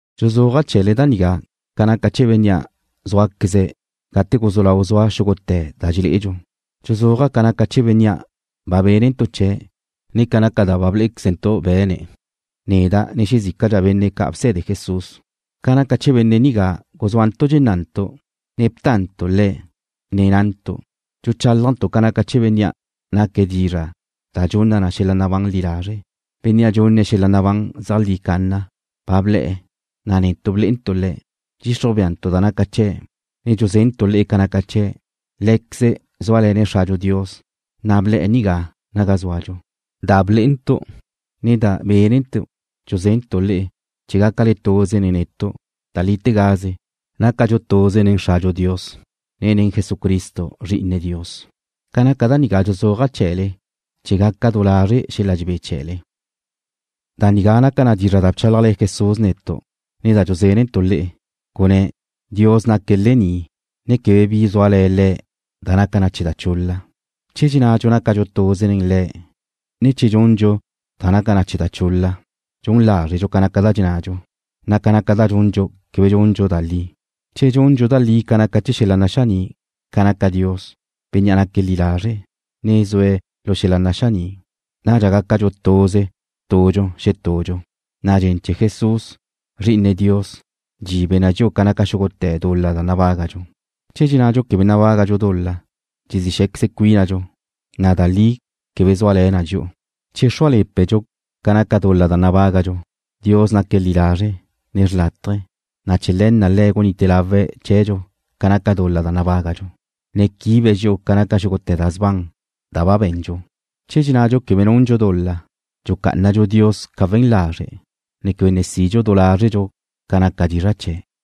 Dxuzúaja' chee̱le da nigá ca naca chee̱ Bénnea' zúaqueze̱' gate guzú lau zua xúgute̱ da dxelé'edxu. Dxuzúaja' ca naca chee̱ Bénnea' ba bénentu' chee̱', ne ca naca da ba blé'equezentu' be̱ne̱', neda' ne xezícadxa benne' ca' bse̱de Jesús. Ca naca chee̱ Benne' nigá guzúantu' dxennantu', ne btantu' Le̱' nen na'ntu'. Dxuchálajntu' ca naca chee̱ Bénnea' naque̱' Dizra' da dxunna na xel-la' nabán li lazre'. Bénnea' dxunne̱' xel-la' nabán zeajlí canna ba ble̱'e̱, na' netu' blé'entu' Le̱'. Dxixruj béantu' da naca chee̱', ne dxuzentu' le'e ca naca chee̱'. Lé̱queze̱' zúale̱ne̱' Xradxu Dios, na' ble̱'e̱ naga zúadxu. Da blé'entu', ne da bénentu' dxuzentu' le'e chee̱ gácale tuze nen netu'. Da lítegaze, nácadxu tuze nen Xradxu Dios, ne nen Jesucristo, Zri'ine Dios. Ca naca da caní dxuzúaja' chee̱le chee̱ gaca du lazre' xel-la' dxebé chee̱le. Da nigá naca dizra' da bchálajle̱ Jesús netu', ne da dxuzentu' le'e. Gunné̱': Dios naque̱' lení', ne quebe bi zúale̱ Le̱' da naca chee̱ da chul-la. Che dxennadxu nácadxu tuze nen Le̱', na' che dxundxu da naca na chee̱ da chul-la, dxun lázredxu ca naca da dxennadxu, na' ca naca da dxundxu quebe dxundxu da li. Che dxundxu da li da naca chee̱ xel-la' naxaní', ca naca Dios, Bénnea' naque̱' li lazre', ne zue̱' lu xel-la' naxaní', nadxa zúadxu tuze tudxu xetudxu, na' dxen chee̱ Jesús, Zri'ine Dios, dxibe na dxi'u ca naca xúgute̱ dul-la nabágadxu. Che dxennadxu quebe nabágadxu dul-la, dxezí xé̱queze cuínadxu, na' da li quebe zúale̱ na dxi'u. Che xrúale̱pedxu ca naca dul-la da nabágadxu, Dios naque̱' li lazre', ne xlátaje̱, na' chee̱ le̱ na' Le̱' gunite lawe̱' chee̱dxu ca naca dul-la da nabágadxu, ne quibe̱' dxi'u ca naca xúgute̱ da sban da ba be̱ndxu. Che dxennadxu quebe nundxu dul-la, dxucá'anadxu Dios ca we̱n lazre', ne quebe ne sidxu du lázredxu ca naca dizra' chee̱'.